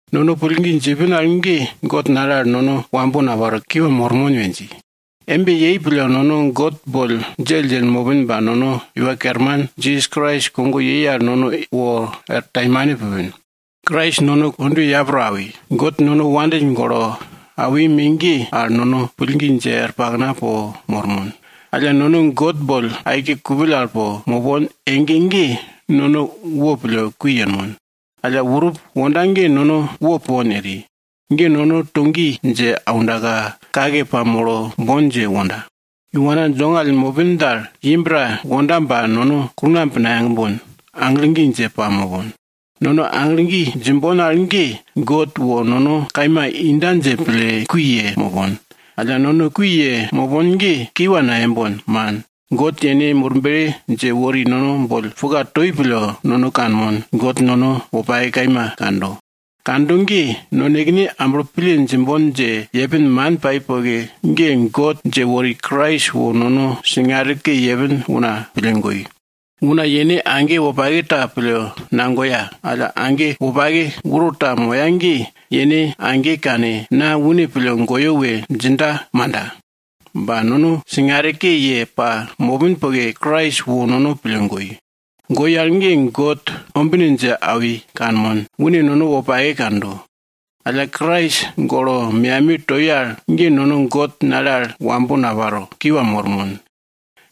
Nono pillgi djipin al ge God nale al nono wambo naparo, kiwa mormon we dji. Embe yei pille nono God boll djelldjell mopin ba nono Iwa Kerman Jisas Krais kogo yei al nono wo er taimane pupin. Krais nono kondwe yapro awi, God nono wopake pille awi me ge al, nono pillgi dje er pakna po mormon. Alla nono God boll aike kupill al po mopon ege ge, nono wopille kui yenmon. Alla urup wonda ge nono wo pupon eri. Ge nono to gi dje aundaka, kake pamolo bon dje wonda. Iwana dongall mopin dal, imb ta wonda ba nono kulngamb nayagbon, aglo gi dje pamopon. Nono aglo gi djimbon al ge, God wo nono kaima inda dje pille kui yemopon. Alla nono kui yemopon ge kiwa nayembon, man. God yene Murble dje wori nono boll puka toi pille, nono kanmon, God nono wopake kaima kando. Kando ge, nonekene amblo pille djimbon dje yepin man pai poke ge, God dje wori Krais wo nono singare ke yepin una pille goi. Una yene age wopake ta pille nagoya. Alla, age wopake uro ta moya ge yene age kane, na une pille goyo we djinda manda? Ba nono singare ke ye pamopin poke, Krais wo nono pille goi. Goi al ge, God ombine dje awi kanmon, une nono wopake kando. Alla Krais golo meyamiye toi al ge, nono God nale al wambo naparo, kiwa mormon.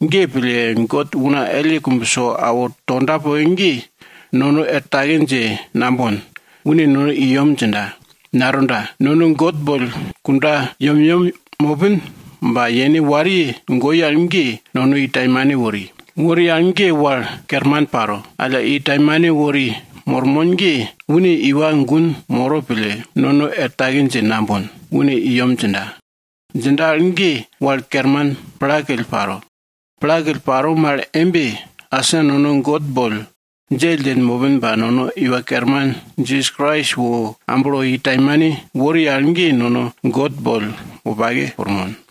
Ge pille, God una elle kumbso awo tonda poke ge, nono er take dje nambon, une nono i yem djinda, natonda. Nono God boll kunda yemyem mopin ba yene wariye goi al ge, nono i taimane wori. Wori al ge wal kerman paro. Alla, i taimane wori mormon ge, une iwa gun moro pille, nono er take dje nambon, une i yem djinda. Djinda al ge wal kerman plakill paro. Plakill paro mal embe, asa nono God boll djelldjell mopin ba nono Iwa Kerman Jisas Krais wo amblo i taimane wori al ge, nono God boll wopake pirmon.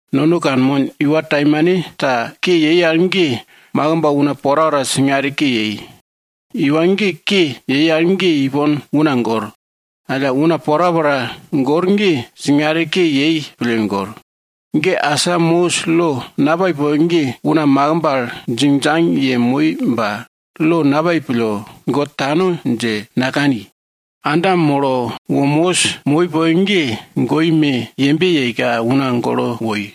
Nono kanmon, iwa taimanta ke yei al ge, makimb una porapora singare ke yei. Iwa ge ke yei al ge ipon una gor. Alla una porapora gor ge, singare ke yei pille gor. Ge asa Mosis lo napai poke ge, una makimb al djingdjang yemoi ba lo napai pille, God tano dje nakani. Adam molo wo Mosis moi poke ge, goi me yembe yeika una golo woi.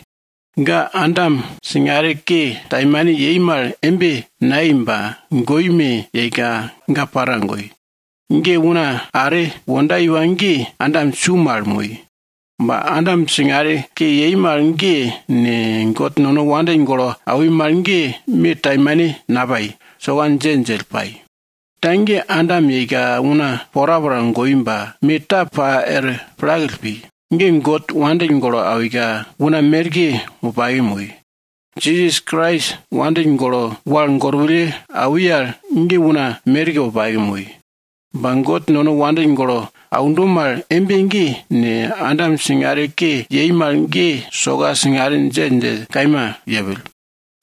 Ga Adam singare ke taimane yei mal embe nayei ba, goi me yeika ga para goi. Ge una are wonda iwa ge, Adam su mal moi. Ba Adam singare ke yei mal ge ne, God nono wal gorwulle kiwa awo wori mal ge me taimane napai, soka djelldjell pai. Ta ge, Adam yeika, una porapora goi ba, me ta pa er plakill pi. Ge God nono wopake pille awika, una merke wopake moi. Jisas Krais nono wopake pille wal gorwulle kiwa awi al ge, una merke wopake moi. Ba God nono wal gorwulle kiwa aundo mal embe ge ne, Adam singare ke yei mal ge soka singare djelldjell kaima yepill.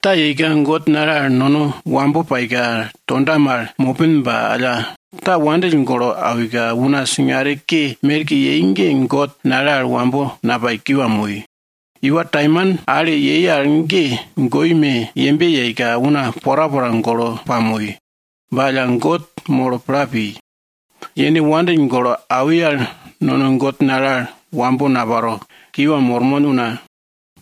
Ta yeika God nale al nono wambo paika, tonda mal mopin ba alla, ta ye wopake ye awika una singare ke merke yei ge God nale al wambo napai, kiwa moi. Iwa taimane ale yei al ge goi me yembe yeika una porapora golo pamoi. Ba alla God molo pla pi. Yene nono wal gorwulle kiwa awo wori al nono God nale al wambo naparo, kiwa mormon,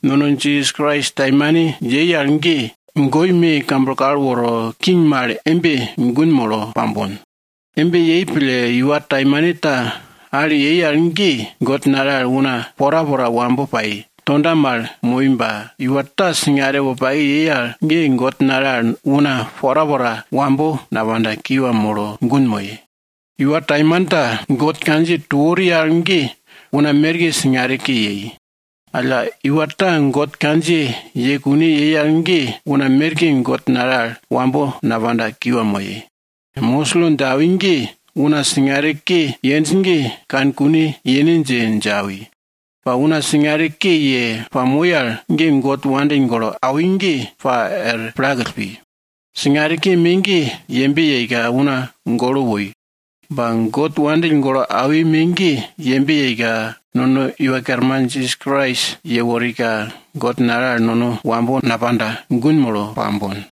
nono Jisas Krais taimane yei al ge, goi me kamblo kal woro, king mal embe gun molo pambon. Embe yei pille iwa taimanta ale yei al ge, God nale al una porapora wambo pai, tonda mal moi ba, iwa ta singare wopake yei al ge, God nale al una porapora wambo napanda, kiwa molo gun moye. Iwa taimanta God kandjiye to wori al ge una merke singare ke yei. Alla, iwa ta God kandjiye ye kune yei al ge, una merke God nale al wambo napanda, kiwa moye. Mosis lo dje awi ge, una singare ke yenj ge kane kune yene dje, dje awi. Ba una singare ke ye pamoi al ge, God nono wopake pille awi ge pa er plakill pi. Singare ke me ge yembe yeika una golo woi. Ba, God nono wopake pille awi me ge, yembe yeika nono Iwa Kerman Jisas Krais yeworika, God nale al nono wambo napanda, gun molo pambon.